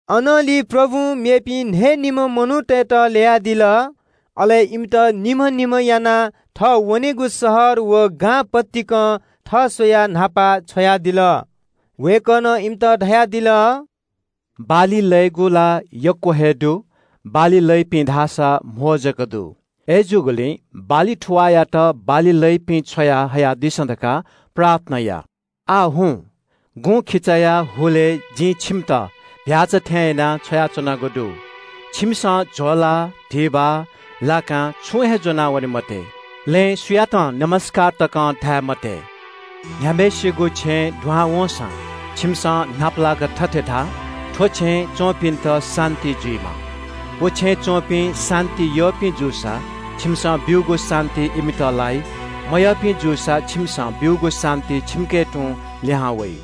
अनंलि प्रभुं मेपिं न्‍हयेम्‍ह मनूतय्‌त ल्‍ययादिल। अले इमित निम्‍ह निम्‍ह यानाः थः वनेगु शहर व गां पतिकं थः स्‍वयाः न्‍हापा छ्वयादिल। वय्‌कलं इमित धयादिल – “बाली लयेगु ला यक्‍व हे दु, बाली लइपिं धाःसा कम जक दु। अय्‌जूगुलिं बाली थुवाःयात बाली लइपिं छ्वयाहयादिसँ धकाः प्रार्थना या। आः हुँ, गुँखिचाया हुलय् जिं छिमित चीधिकःम्‍ह भ्‍याःचा थें यानाः छ्वयाच्‍वनागु दु। छिमिसं म्‍हिचा, धिबा, लाकां छुं हे ज्‍वनावने मते। लँय् सुयातं ज्‍वजलपा तकं धाये मते। “न्‍ह्याम्‍हय्‌सिगु छेँय् दुहां वंसां छिमिसं न्‍हापालाक थथे धा – ‘थ्‍व छेँय् च्‍वंपिन्‍त शान्‍ति जुइमा।’ व छेँय् च्‍वंपिं शान्‍ति यःपिं जूसा छिमिसं ब्‍यूगु शान्‍ति इमित लाइ। मयःपिं जूसा छिमिसं ब्‍यूगु शान्‍ति छिमिके तुं लिहां वइ।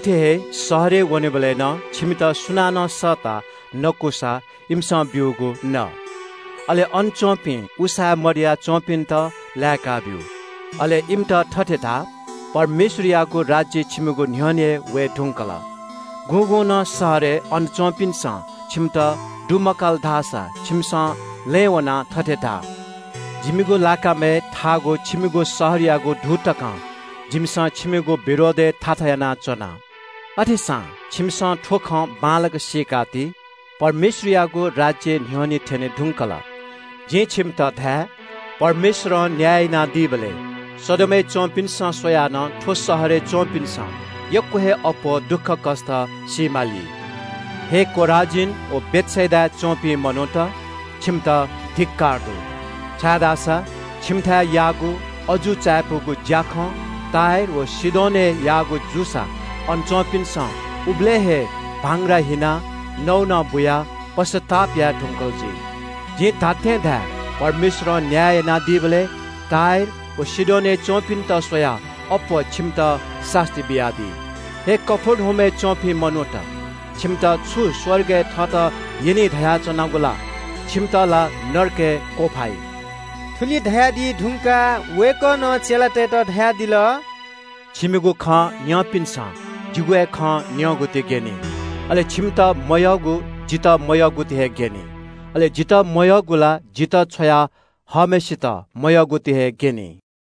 “अथे हे शहरय् वनेबलय् नं छिमित सुनानं सःताः नकूसा इमिसं ब्‍यूगु न। अन च्‍वंपिं उसाँय् मदया च्‍वंपिन्‍त लाय्‌काब्‍यु। अले इमित थथे धा – ‘परमेश्‍वरयागु राज्‍य छिमिगु न्‍ह्यःने वये धुंकल।’ गुगुं नं शहरय् अन च्‍वंपिन्‍सं छिमित दुमकाल धाःसा छिमिसं लँय् वनाः थथे धा – ‘जिमिगु लाकामय् थाःगु छिमिगु शहरयागु धू तकं जिमिसं छिमिगु विरोधय् थाथा यानाच्‍वना। अथेसां छिमिसं थ्‍व खँ बांलाक सीकाति – परमेश्‍वरयागु राज्‍य न्‍ह्यःने थ्‍यने धुंकल।’ जिं छिमित धाये – परमेश्‍वरं न्‍याय यानादीबलय् सदोमय् च्‍वंपिन्‍सं स्‍वयाः नं थ्‍व शहरय् च्‍वंपिन्‍सं यक्‍व हे अप्‍वः दुःखकष्‍ट सी माली।” “हे खोराजीन व बेथसेदाय् च्‍वंपिं मनूत, छिमित धिक्‍कार दु, छाय्‌धाःसा छिमिथाय् याःगु अजू चायापुगु ज्‍याखँ टुरोस व सीदोनय् याःगु जूसा अन च्‍वंपिन्‍सं उबलय् हे भांग्रा हिनाः नौनं बुयाः पश्‍चाताप याये धुंकल जुइ। जिं धात्‍थें धाये – परमेश्‍वरं न्‍याय यानादीबलय् टुरोस व सीदोनय् च्‍वंपिन्‍त स्‍वयाः अप्‍वः छिमित सास्‍ती बियादी। ‘हे कफर्नहुमय् च्‍वंपिं मनूत, छिमित छु स्‍वर्गय् थत यनी धयाच्‍वनागु ला? छिमित ला नरकय् क्‍वफाइ।’” थुलि धयादी धुंकाः वय्‌कलं चेलातय्‌त धयादिल – “छिमिगु खँ न्‍यंपिन्‍सं जिगु हे खँ न्‍यंगुति ग्‍यनी। अले छिमित मयःगु जितः मयःगुति हे ग्‍यनी। अले जितः मयःगु ला जितः छ्वया हःम्‍हय्‌सित मयःगुति हे ग्‍यनी।”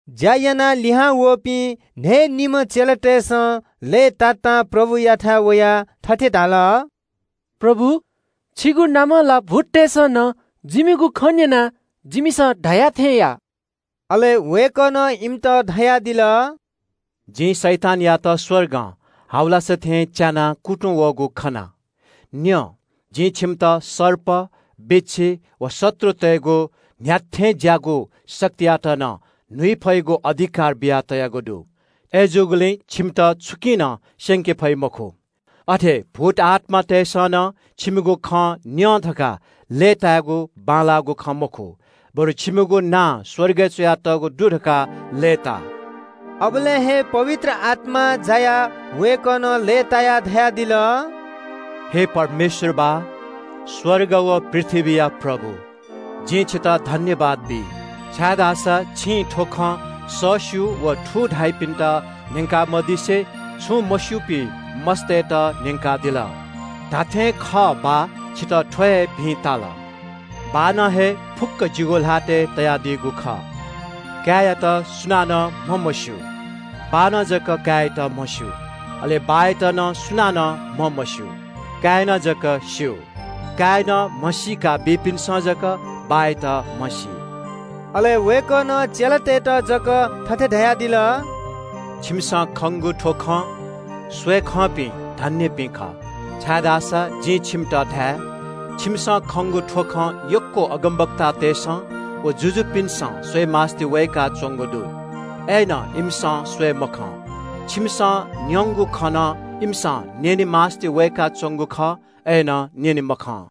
ज्‍या यानाः लिहांवःपिं न्‍हयेम्‍ह चेलातय्‌सं लय्‌तातां प्रभुयाथाय् वयाः थथे धाल – “प्रभु, छिगु नामं ला भूततय्‌सं नं जिमिगु खँ न्‍यनाः जिमिसं धया थें याः।” अले वय्‌कलं इमित धयादिल – “जिं शैतानयात स्‍वर्गं हाबलासा थें च्‍यानाः कुतुं वःगु खना। न्‍यँ, जिं छिमित सर्प, बिच्‍छी व शत्रुतय्‌गु न्‍ह्याथें ज्‍याःगु शक्तियात नं न्‍हुइ फइगु अधिकार बियातयागु दु। अय्‌जूगुलिं छिमित छुकिं नं स्‍यंके फइ मखु। अथे भूत आत्‍मातय्‌सं नं छिमिगु खँ न्‍यं धकाः लय्‌तायेगु बांलाःगु खँ मखु, बरु छिमिगु नां स्‍वर्गय् च्‍वयातःगु दु धकाः लय्‌ता।” अबलय् हे पवित्र आत्‍मां जायाः वय्‌कलं लय्‌तायाः धयादिल – “हे परमेश्‍वर बाः, स्‍वर्ग व पृथ्‍वीया प्रभु, जिं छितः सुभाय् बी, छाय्‌धाःसा छिं थ्‍व खँ सःस्‍यू व थू धाइपिन्‍त न्‍यंका मदिसे छुं मस्‍यूपिं मस्‍तय्‌त न्‍यंकादिल। धात्‍थें हे खः बाः, छितः थ्‍व हे भिं ताल।” “बाःनं हे फुक्‍क जिगु ल्‍हातय् तयादीगु खः। काय्‌यात सुनानं म्‍हमस्‍यू। बाःनं जक काय्‌यात म्‍हस्‍यू। अले बाःयात नं सुनानं म्‍हमस्‍यू, काय्‌नं जक स्‍यू। काय्‌नं म्‍हसीका बीपिन्‍सं जक बाःयात म्‍हसी।” अले वय्‌कलं चेलातय्‌त जक थथे धयादिल – “छिमिसं खंगु थ्‍व खँ स्‍वयेखंपिं धन्‍यपिं खः, छाय्‌धाःसा जिं छिमित धाये – छिमिसं खंगु थ्‍व खँ यक्‍व अगमवक्तातय्‌सं व जुजुपिन्‍सं स्‍वयेमास्‍ति वय्‌काच्‍वंगु दु, अय्‌नं इमिसं स्‍वये मखं। छिमिसं न्‍यंगु खँ नं इमिसं न्‍यने मास्‍ति वय्‌काच्‍वंगु खः, अय्‌नं न्‍यने मखं।”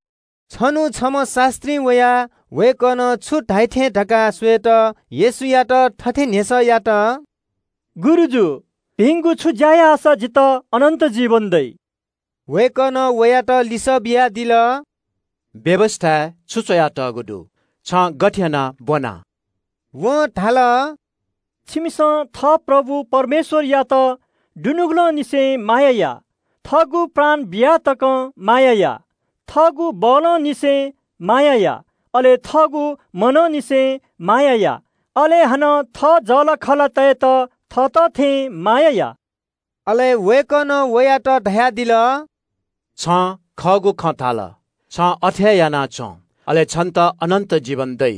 छन्‍हु छम्‍ह शास्‍त्रीं वयाः वय्‌कलं छु धाइ थें धकाः स्‍वयेत येशूयात थथे न्‍ह्यसः यात – “गुरुजु, भिंगु छु ज्‍या याःसा जितः अनन्‍त जीवन दइ?” वय्‌कलं वयात लिसः बियादिल – “व्‍यवस्‍थाय् छु च्‍वयातःगु दु? छिं गथे यानाः ब्‍वनादिया?” वं धाल – “परमप्रभु झी परमेश्‍वरयात दुनुगलंनिसें माया या, थःगु प्राण बिया तकं माया या, थःगु बलं फत्तले माया या, अले थःगु मनंनिसें माया या। अले हानं थः जःलाखःलातय्‌त थःत थें माया या।” अले वय्‌कलं वयात धयादिल – “छिं खःगु खँ धयादिल। छिं अथे हे यानादिसँ, अले छितः अनन्‍त जीवन दइ।”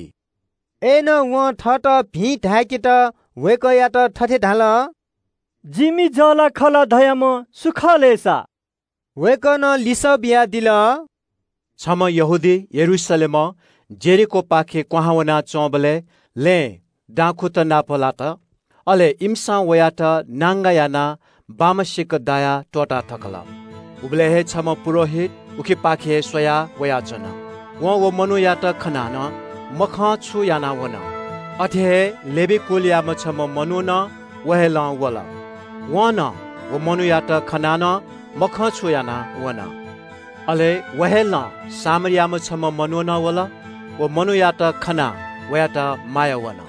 अय्‌नं वं थःत भिं धाय्‌केत वय्‌कःयात थथे धाल – “जिमि जःलाखःला धाःम्‍ह सु खः लय् सा?” वय्‌कलं लिसः बियादिल – “छम्‍ह यहूदी यरूशलेमं यरीहोपाखे क्‍वहां वनाच्‍वंबलय् लँय् दाखुँत नापलात। अले इमिसं वयात नांगा यानाः बाम्‍ह सिक दायाः त्‍वःताथकल। “उबलय् हे छम्‍ह पुजाहारी उखेपाखे हे स्‍वयाः वयाच्‍वन। वं व मनूयात खनाः नं मखंछु यानाः वन। अथे हे लेवी कुलयाम्‍ह छम्‍ह मनू नं व हे लं वल। वं नं व मनूयात खनाः नं मखंछु यानाः वन। “अले व हे लं छम्‍ह सामरी मनू नं वल। व मनूयात खनाः वयात माया वन।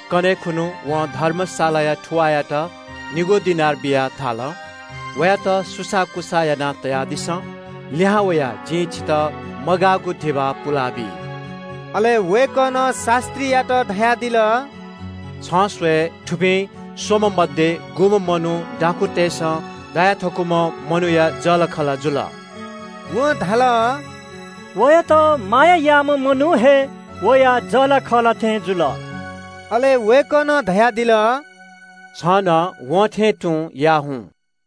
कन्‍हय् खुन्‍हु वं धर्मशालाया थुवाःयात निगू दिनार बियाः धाल – ‘वयात सुसाःकुसाः यानातयादिसँ। लिहां वयाः जिं छितः मगाःगु धिबा पुलाबी।’” अले वय्‌कलं शास्‍त्रीयात धयादिल – “छिं स्‍वयेबलय् थुपिं स्‍वम्‍ह मध्‍ये गुम्‍ह मनू दाखुँतय्‌सं दाया थकूम्‍ह मनूया जःलाखःला जुल?” वं धाल – “वयात माया याःम्‍ह मनू हे वया जःलाखःला थें जुल।” अले वय्‌कलं धयादिल – “छिं नं वं थें तुं याः झासँ।”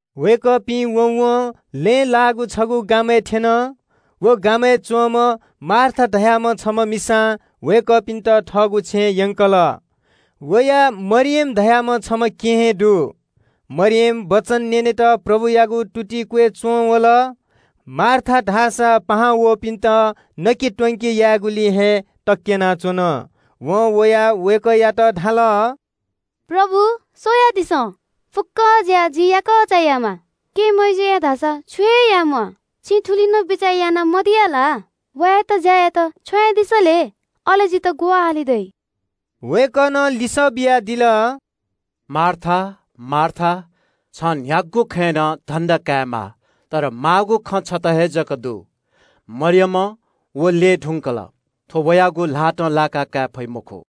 वय्‌कःपिं वँवं लँय् लाःगु छगू गामय् थ्‍यन। व गामय् च्‍वंम्‍ह मार्था धाःम्‍ह छम्‍ह मिसां वय्‌कःपिन्‍त थःगु छेँय् यंकल। वया मरियम धाःम्‍ह छम्‍ह केहेँ दु। मरियम वचन न्‍यनेत प्रभुयागु तुति क्‍वय् च्‍वंवल। मार्था धाःसा याकःचा पाहां वःपिन्‍त नके त्‍वंके यायेगुलिइ हे अलमल जुयाच्‍वन। वं वयाः वय्‌कःयात धाल – “प्रभु, स्‍वयादिसँ, फुक्‍क ज्‍या जि याकःचां हे यायेमाः। केहेँ मय्‌जुं धाःसा छुं हे मया। छिं थुलि नं बिचाः याना मदिया ला? वयात ज्‍या यायेत छ्वयादिसँ लय्, अले जितः ग्‍वाहालि दइ।” वय्‌कलं लिसः बियादिल – “मार्था, मार्था, छं न्‍ह्यागु खँय् नं छाय् धन्‍दा कयाच्‍वनागु? माःगु खँ छता हे जक दु। मरियमं व ल्‍यये धुंकल। थ्‍व वयागु ल्‍हातं लाकाकाये फइ मखु।”